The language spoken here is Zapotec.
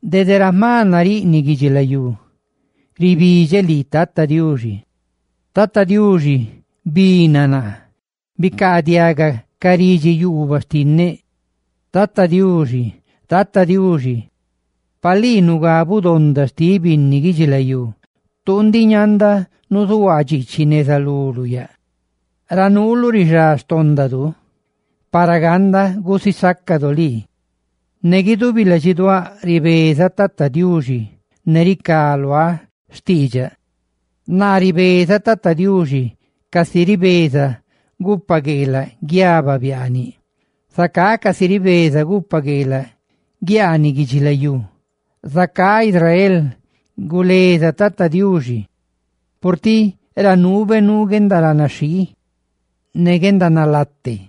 Dede ra jma nariꞌniꞌ guidxilayúribidxeꞌ lii, Tata Diuxi: ¡Tata Diuxi, bicaadiaga ridxi xtinneꞌ!, ¡bicaadiaga ca ridxi yuubaꞌ xtinneꞌ! Tata Diuxi, Tata Diuxi, pa lii nugabuꞌ donda xtiꞌ binni guidxilayú, tuu ndiꞌ ñanda nuzuhuaa dxiichiꞌ neza luluꞌ yaꞌ. Ra nuuluꞌ rixá xtóndadu, para ganda gusisácadu lii. Ne guidubi ladxiduáꞌ ribezaꞌ Tata Diuxi, ne ricá luáꞌ xtiidxaꞌ. Naa ribezaꞌ Tata Diuxi casi ribeza gupagueelaꞌa guiaba biaaniꞌ. Zacá casi ribeza gupagueelaꞌ guiaaniꞌ guidxilayú, huaxa lii, Israel, guleza Tata Diuxi, purtiꞌ ra nuube nuu guendaranaxhii ne guendanalate.